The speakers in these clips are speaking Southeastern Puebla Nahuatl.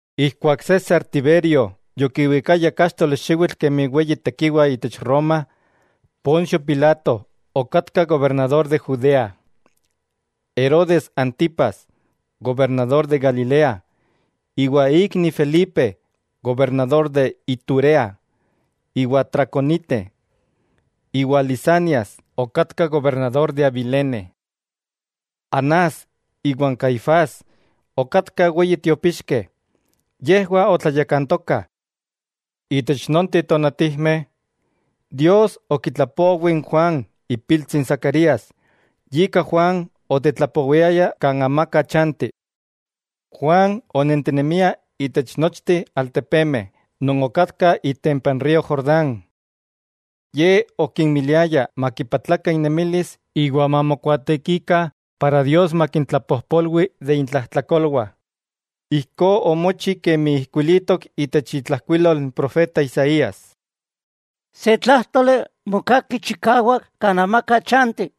Ijkuak César Tiberio yokiwikaya káxtoli xiwitl kemi weyi tekiwa itech Roma, Poncio Pilato okatka gobernador de Judea, Herodes Antipas gobernador de Galilea, iwa ikni Felipe gobernador de Iturea iwa Traconite, iwa Lisanias okatka gobernador de Abilene. Anás iwa n Caifás okatkah weyi tiopixkeh, yejwah otlayakantokah. Itech nonteh tonatijmeh, Dios okitlapowi n Juan ipiltsi n Zacarías, yika Juan otetlapowiaya kan amaka chanti. Juan onentinemia itech nochteh altepemeh non okatkah itempa n río Jordán. Ye okinmiliaya makipatlakah innemilis iwa mamokuaatekikah para Dios makintlapojpolwi de intlajtlakolwah. Ijkó omochi kemi ijkuilitok itech itlajkuilol n profeta Isaías: Se tlájtoli mokaki chikawak kan amaka chanti: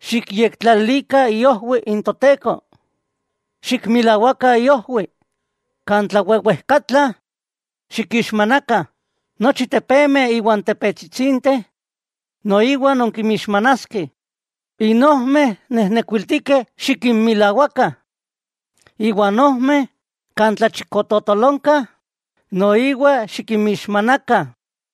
“Xikyektlalilikah iojwiu n Toteko, Xikmilawakah iojwiu. Kan tlawewejkatla, xikixmanakah, nochi tepemeh iwa n tepetsitsinteh noiwa nonkinmixmanaskeh, n ojmeh nenekuiltikeh xikinmilawakah, iwa n ojmeh kan tlalchikototolonka noiwa xikinmixmanakah.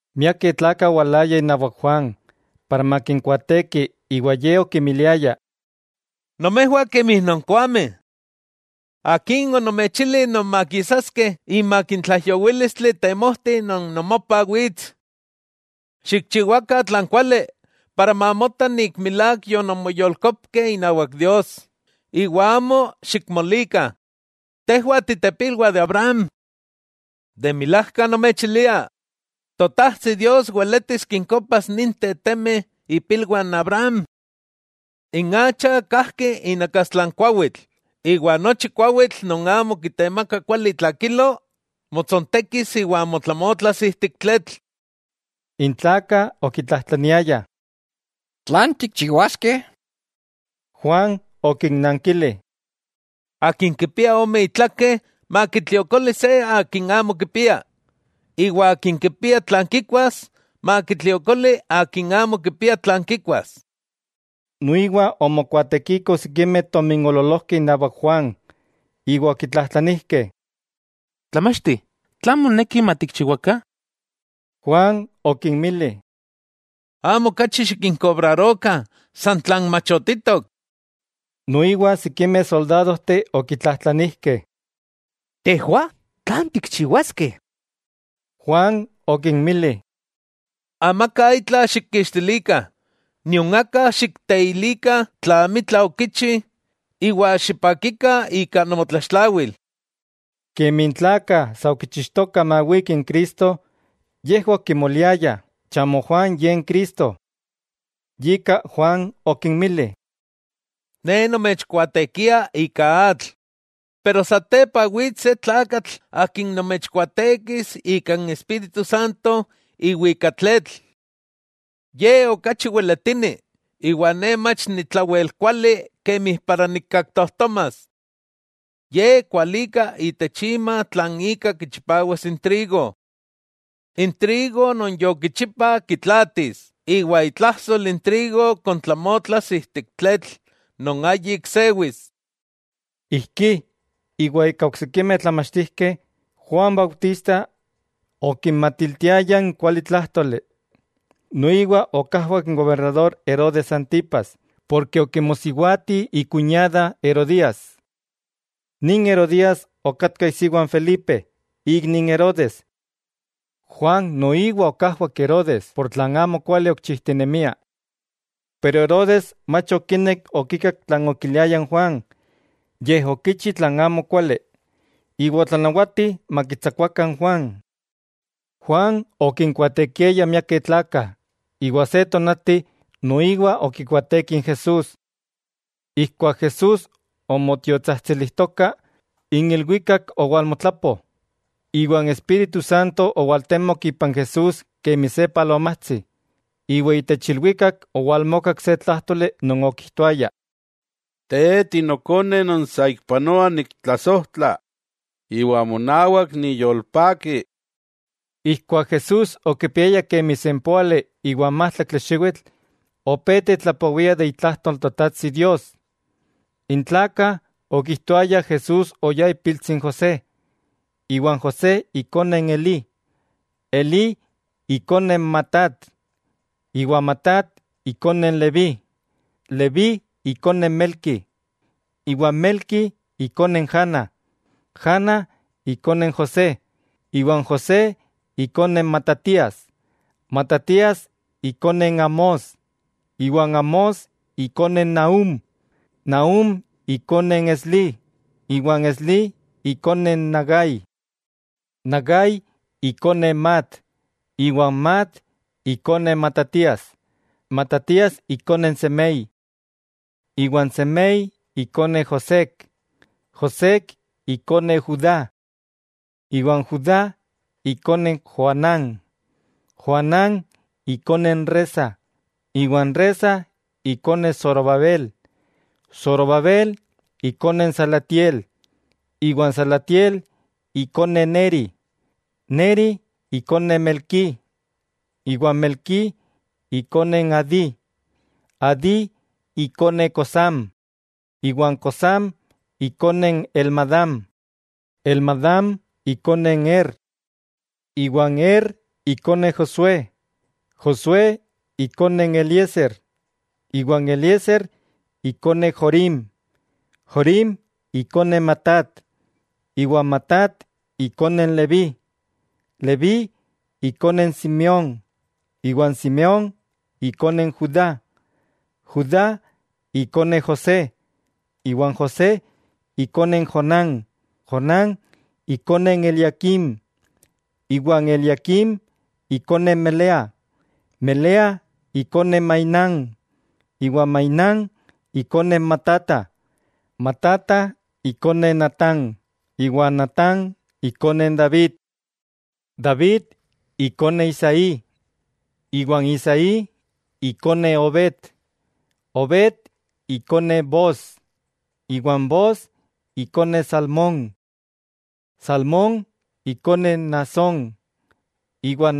Miakeh tlakah owalayah inawak Juan, para makinkuaateki iwa ye okimiliaya: —¡Nomejwah kemi nonkoameh! ¿Akin onomechili nonmakisaskeh imak tlaijyowílistli temojti non nomopah wits? Xikchiwakah tlan kuali para mamota milák yononmoyolkopkeh inawak Dios, iwa amo xikmolikah: “Tejwah titepilwah de Abraham.” De milajka nomechilia, Totajtsi Dios weletis kinkopas ninteh temeh ipilwah n Abraham. N acha kajki inakastla n kuawitl, iwa nochi kuawitl non amo kitemaka kuali itlakilo, motsontekis iwa motlamotlas ijtik tletl. N tlakah okitlajtlaniayah: —¿Tlan tikchiwaskeh? Juan okinnankili: —Akin kipia ome itlakeh makitliokoli se akin amo kipia. Iwa akin kipia tlan kikuas, makitliokoli akin amo kipia tlan kikuas. Noiwa omokuaatekikoh sikimeh tominoololojkeh inawak Juan, iwa okitlajtlanijkeh: —Tlamachti, ¿tlan moneki matikchiwakah? Juan okinmili: —Amo okachi xikinkobrarokah san tlan machotitok. Noiwa sikimeh soldadojteh okitlajtlanijkeh: —Tejwah, ¿tlan tikchiwaskeh? Juan okinmili: —Amaka itla xikkixtilikah, nion aka xikteilikah tla amitla okichi iwa xipakikah ika nomotlaxtlawil. Kemi n tlakah sa okichixtokah mawiki n Cristo, yejwah okimoliayah chamo Juan ye n Cristo. Yika Juan okinmili: —Ne nomechkuaatekia ika atl, pero satepa wits se tlakatl Akin nomechkuaatekis ika n Espíritu Santo iwa ika tletl. Ye okachi weletini, iwa ne mach ni tlawel kuali kemi para nikaktojtomas. Ye kualika itech ima tlan ika kichipawas n trigo. N trigo non yokichipa kitlaatis, iwa itlajsol n trigo kontlamotlas ijtik tletl non ayik sewis. Ijkí, iwa ika oksikimeh tlamachtijkeh, Juan Bautista okinmatiltiaya n kualitlájtoli. Noiwa okajwak n gobernador Herodes Antipas; porke okimosiwati ikuñada Herodías. Nin Herodías okatka isiwa n Felipe, ikni n Herodes. Juan noiwa okajwak Herodes ika tlan amo kuali okichijtinemia. Pero Herodes mach okinek okikak tlan okiliaya n Juan, yej okichi tlan amokuali, iwa otlanawati makitsakuakah n Juan. Juan okinkuaatekiaya miakeh tlakah, iwa se tonati noiwa okikuaateki n Jesús. Ijkuak Jesús omotiotsajtsilijtoka, n ilwikak owalmotlapo, iwa n Espíritu Santo owaltemok ipan Jesús kemi se palomatsi, iwa itech ilwikak owalmokak se tlájtoli non okijtoaya: —Te Ti Nokone non saikpanoa niktlasojtla, iwa monawak niyolpaki. Ijkuak Jesús okipiaya kemi sempóali iwa n májtlaktli xiwitl opé tetlapowia de itlajtol n Totajtsi Dios. N tlakah okijtoayah Jesús oyá ipiltsi n José, iwa n José ikone n Elí, Elí ikone Matat, iwa Matat ikone n Leví, Leví ikone Melqui, iwa Melqui ikone n Jana, Jana ikone n José, iwa n José ikone Matatías, Matatías ikone n Amós, iwa n Amós ikone Nahúm, Nahúm ikone n Eslí, iwa n Eslí ikone n Nagai, Nagai ikone Maat, iwa n Maat ikone Matatías, Matatías ikone n Semei, iwa n Semei ikone Joséc, Joséc ikone Judá, iwa n Judá ikone Joanán, Joanán ikone n Resa, iwa n Resa ikone Zorobabel, Zorobabel ikone n Salatiel, iwa n Salatiel ikone Neri, Neri ikone Melquí, iwa n Melquí ikone n Adí, Adí ikone Cosam, iwa n Cosam ikone n Elmadam, Elmadam ikone n Er, iwa n Er ikone Josué, Josué ikone n Eliezer, iwa n Eliezer ikone Jorim. Jorim ikone Matat, iwa Matat ikone n Leví, Leví ikone n Simeón, iwa n Simeón ikone n Judá. Judá ikone José, iwa n José ikone n Jonán, Jonán ikone n Eliaquim, iwa n Eliaquim ikone Melea. Melea ikone Mainán, iwa n Mainán ikone Matata. Matata ikone Natán, iwa n Natán ikone n David. David ikone Isaí, iwa n Isaí ikone Obed, Obed ikone Booz, iwa n Booz ikone Salmón. Salmón ikone n Naasón, iwa n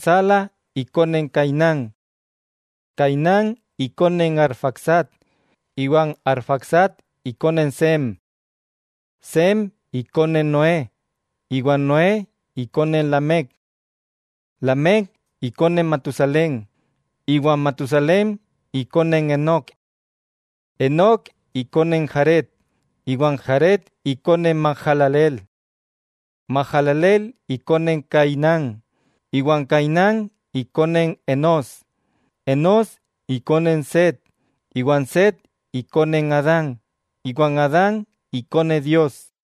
Sala ikone n Cainán. Cainán ikone n Arfaxad, iwa n Arfaxad ikone n Sem. Sem ikone Noé, iwa n Noé ikone n Lamec. Lamec ikone Matusalén, iwa Matusalén ikone n Enok. Enok ikone n Jared, iwa n Jared ikone n Mahalaleel. Mahalaleel ikone n Cainán, iwa n Cainán ikone n Enós. Enós ikone n Set, iwa n Set ikone n Adán, iwa n Adán ikone Dios.